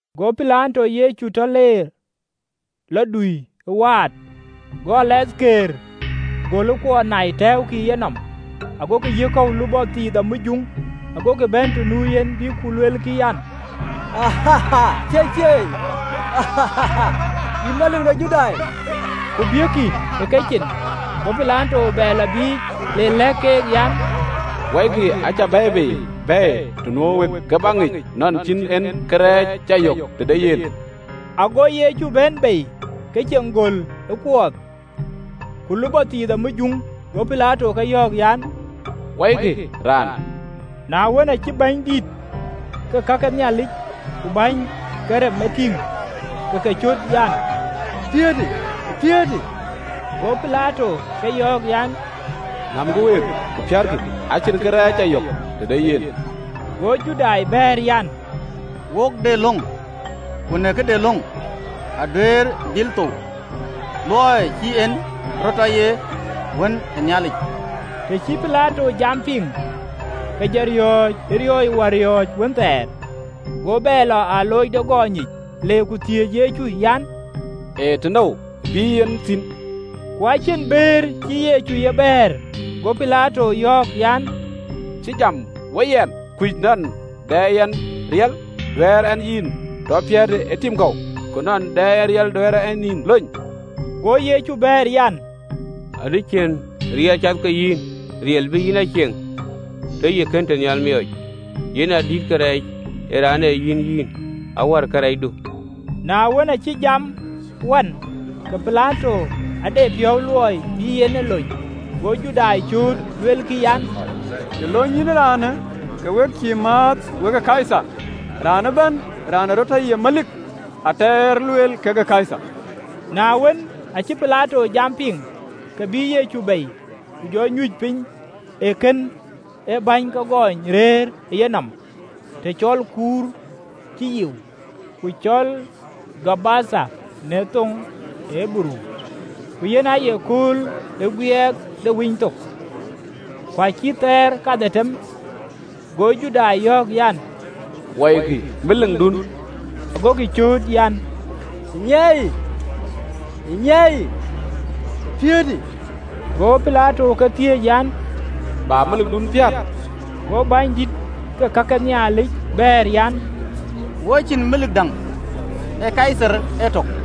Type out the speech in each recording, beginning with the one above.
Go Pilato Yecu tɔ leerë, le dui ë waat. Go alathkëër göl ë kuɔɔth nai, ku tɛ̈ɛ̈ukï ë yenɔm, agokï yiëk kɔ̈u lupɔ thiith amujuŋ, agokï bɛ̈n të nu yen, bïk ku luelkï an, “Thieithieei, yïn Melik de Judai!” Ku biëëkkï ë kecin. Go Pilato bɛ lɔ biic, le lɛ̈k keek an, “Wɔikï acä bɛ̈ɛ̈i bei bɛ̈ɛ̈i të nuö wek, ke bäk ŋic nɔn cïn en awäny cä yök tëde yen.” Ago Yecu bɛ̈n bei, ke ceŋ göl ë kuɔɔth, ku lupɔ thiith amujuŋ. Go Pilato ke yɔ̈ɔ̈k an, “Wɔikï raan!” Na wën, aacï bänydït ke ka ke Nhialic ku bäny ke rem de Luaŋdït e tïŋ, ke ke cöt an, “Piäätë, piäätë!” Go Pilato ke yɔ̈ɔ̈k an, “Nämkï week, ku piäätkï. Acïn awäny cä yök tëde yen.” Go Judai bɛ̈ɛ̈r an, “Wok de löŋ, ku në këde löŋë aduëër dhil thou, luɔi cï en rɔt tɔ ye Wën ë Nhialic.” Të cï Pilato jamë piŋ, ke jɔ riɔ̈ɔ̈c ë riɔ̈ɔ̈c wär wënthɛɛr. Go bɛ lɔ ë alooc de gɔny yic, le ku thiëëc Yecu an, “Ee tënou ë bï yïn thïn?” Ku acïn bëër cïï Yecu ye bɛ̈ɛ̈r. Go Pilato yɔ̈ɔ̈k an, “Cïï jam we yɛn? Kuc nɔn dɛ yɛn riɛl duɛ̈ɛ̈r ɛn yïn tɔ piëëtë ë tim kɔ̈u, ku nɔn dɛ yɛn riɛl duɛ̈ɛ̈r ɛn yïn lony?” Go Yecu bɛ̈ɛ̈r an, “Acïn riɛl cath ke yïn riɛl bï yïn a cieŋ, tëë yï kënë tënhial miɔɔc: yen a dïïtë kërɛɛc ë raan ë yïn a yïn, awär kërɛɛcdu.” Na wën, aacï jamë wan, ke Pilato ade piɔ̈u luɔi bï en e lony: go Judai cööt, luelkï an, “Të lony yïn raanë, ke we cïï määth we Kaithar! Raan ëbɛ̈n raan ee rɔt tɔ ye melik ee ater lueel kekë Kaithar!” Na wën, aacï Pilato jamë piŋ, ke bïï Yecu bei, ku jɔ nyuc piny ë kën ee bäny ke gɔny rëër ë yenɔm, të cɔl “Kuur cï Yiu.” (Ku cɔl “Gabatha” në thoŋ ë Ɣeberuu.) Ku yen aye kööl ë Guiɛɛk de Winythok, ku acït thaar kadhetem. Go Judai yɔ̈ɔ̈k an, “Wɔikï Melikdun!” Agokï cööt an, “Nyaaiyë! Nyaaiyë! Piäätë!” Go Pilato ke thiëëc an, “Bä Melikdun piäät?” Go bänydït ke ka ke Nhialic bɛ̈ɛ̈r an, “Wo cïn melik däŋ, ee Kaithar etök!”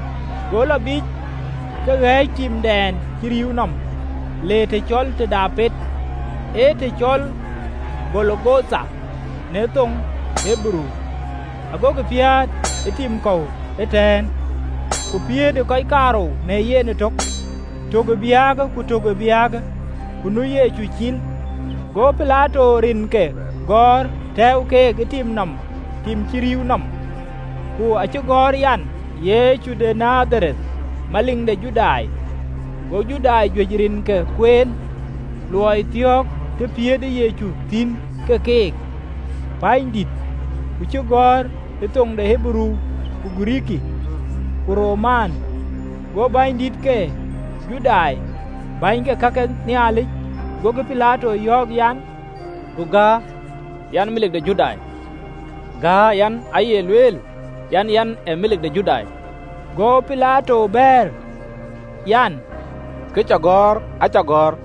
Go lɔ biic, ke ɣɛ̈ɛ̈c timdɛn cï rïïu nɔm, le të cɔl Apet, ee të cɔl Golgotha në thoŋ ë Ɣeberuu: agokï piäät ë tim kɔ̈u ëtɛ̈ɛ̈n, ku piëëtë kɔc kaarou në yen ëtök, tök ë biäkë, ku tök ë biäkë, ku nu Yecu cil. Go Pilato rinke gɔ̈ɔ̈r, tɛ̈ɛ̈u keek ë tim nɔm tim cï rïïu nɔm. Ku acï gɔ̈ɔ̈r an, “Yecu de Nadhareth, Melik de Judai.” Go Judai juëc rinke kueen: luɔi thiɔ̈ɔ̈kë të piëëtë Yecu thïn kekë pänydït, ku cï gɔ̈ɔ̈r ë thoŋ ë Ɣeberuu, ku Girikii, ku Roman. Go bänydït ke Judai ku bäny ke ka ke Nhialic, gokï Pilato yɔ̈ɔ̈k an, “Du gäär, an, ‘Melik de Judai,’ gäär an, ‘Aye raanë lueel an, Yɛn ee Melik de Judai.”’ Go Pilato bɛ̈ɛ̈r an, “Kë cä gɔ̈ɔ̈r, acä gɔ̈ɔ̈r.”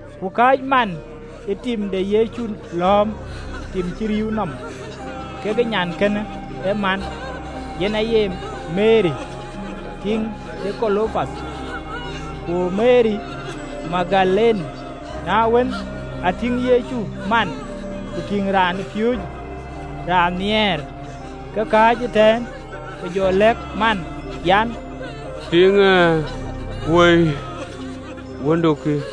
Ku kääc man ë tim de Yecu lɔ̈ɔ̈m tim cï rïïu nɔm, kekë nyankënë ë man, yen aye Meri tiiŋ de Klopath, ku Meri Magdalene. Na wën, a tïŋ Yecu man, ku tïŋ raanpiööcë raan nhiɛɛr ke kääc ëtɛ̈ɛ̈n, ke jɔ lɛ̈k man an, “Tiiŋë, woi, wëndu kï!”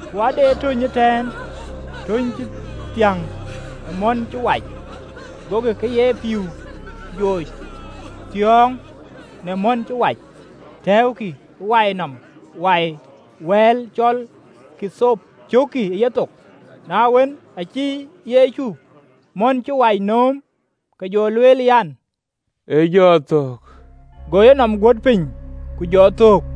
Ku ade töny cï thiäŋ ë mɔ̈n cï wac: gokï kë ye pïïu jooc thiɔ̈ɔ̈ŋ në mɔ̈n cï wac, tɛ̈ɛ̈ukï ë wai nɔm wai ë wɛ̈ɛ̈l cɔl ɣathop, ku cookkï ë yethok. Na wën, aacï Yecu mɔ̈n cï wac nööm, ke jɔ lueel an, “Ë jɔ thök!” Go enɔm guöt piny, ku jɔ thöök.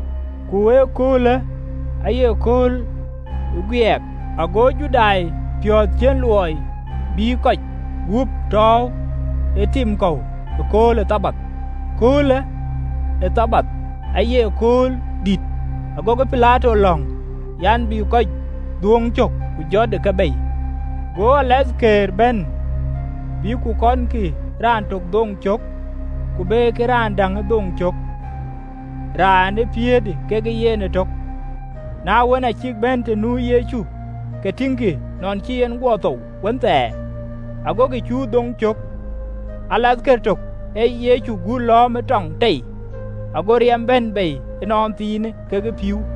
Ku ëköölë aaye kööl ë Guiɛɛk: ago Judai piɔ̈ɔ̈th ciën luɔi bï kɔc gup tɔ̈u ë tim kɔ̈u ëkööl ë Thabath (kööl ë Thabathë aaye kööl dït), agokï Pilato lɔ̈ŋ an, bï kɔc dhuööŋ cök, ku jötë ke bei. Go alathkëër bɛ̈n, bïk ku kɔnkï raan tök dhoŋ cök, ku bekï raan däŋë dhoŋ cök, raan ë piëëtë kekë yen ëtök. Na wën, aa cïk bɛ̈n të nu Yecu, ke tïŋkï nɔn cï en guɔ thou wënthɛɛr, agokï cuö dhoŋ cök Go alathkër tök Yecu gut lɔ̈ɔ̈m ë tɔŋ tei, ago riɛm bɛ̈n bei ënɔnthiinë kekë pïïu.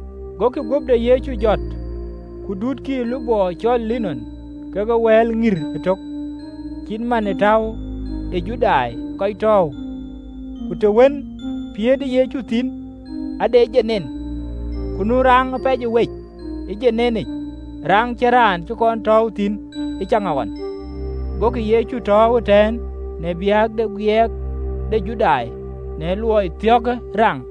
Gokï guöp de Yecu jɔt, ku dutkï ë lupɔ cɔl linɔn, kekë wɛl ŋïr ëtök, cït man ë täu ee Judai kɔc tɔ̈ɔ̈u. Ku të wën piëëtë Yecu thïn ade dom, ku nu raŋ ë piɛc wec domic, raŋ cïn raan cï kɔn tɔ̈ɔ̈u thïn ëcaŋɣɔn. Gokï Yecu tɔ̈ɔ̈u ëtɛ̈ɛ̈n, në biäk de Guiɛɛk de Judai, në luɔi thiɔ̈kë raŋ.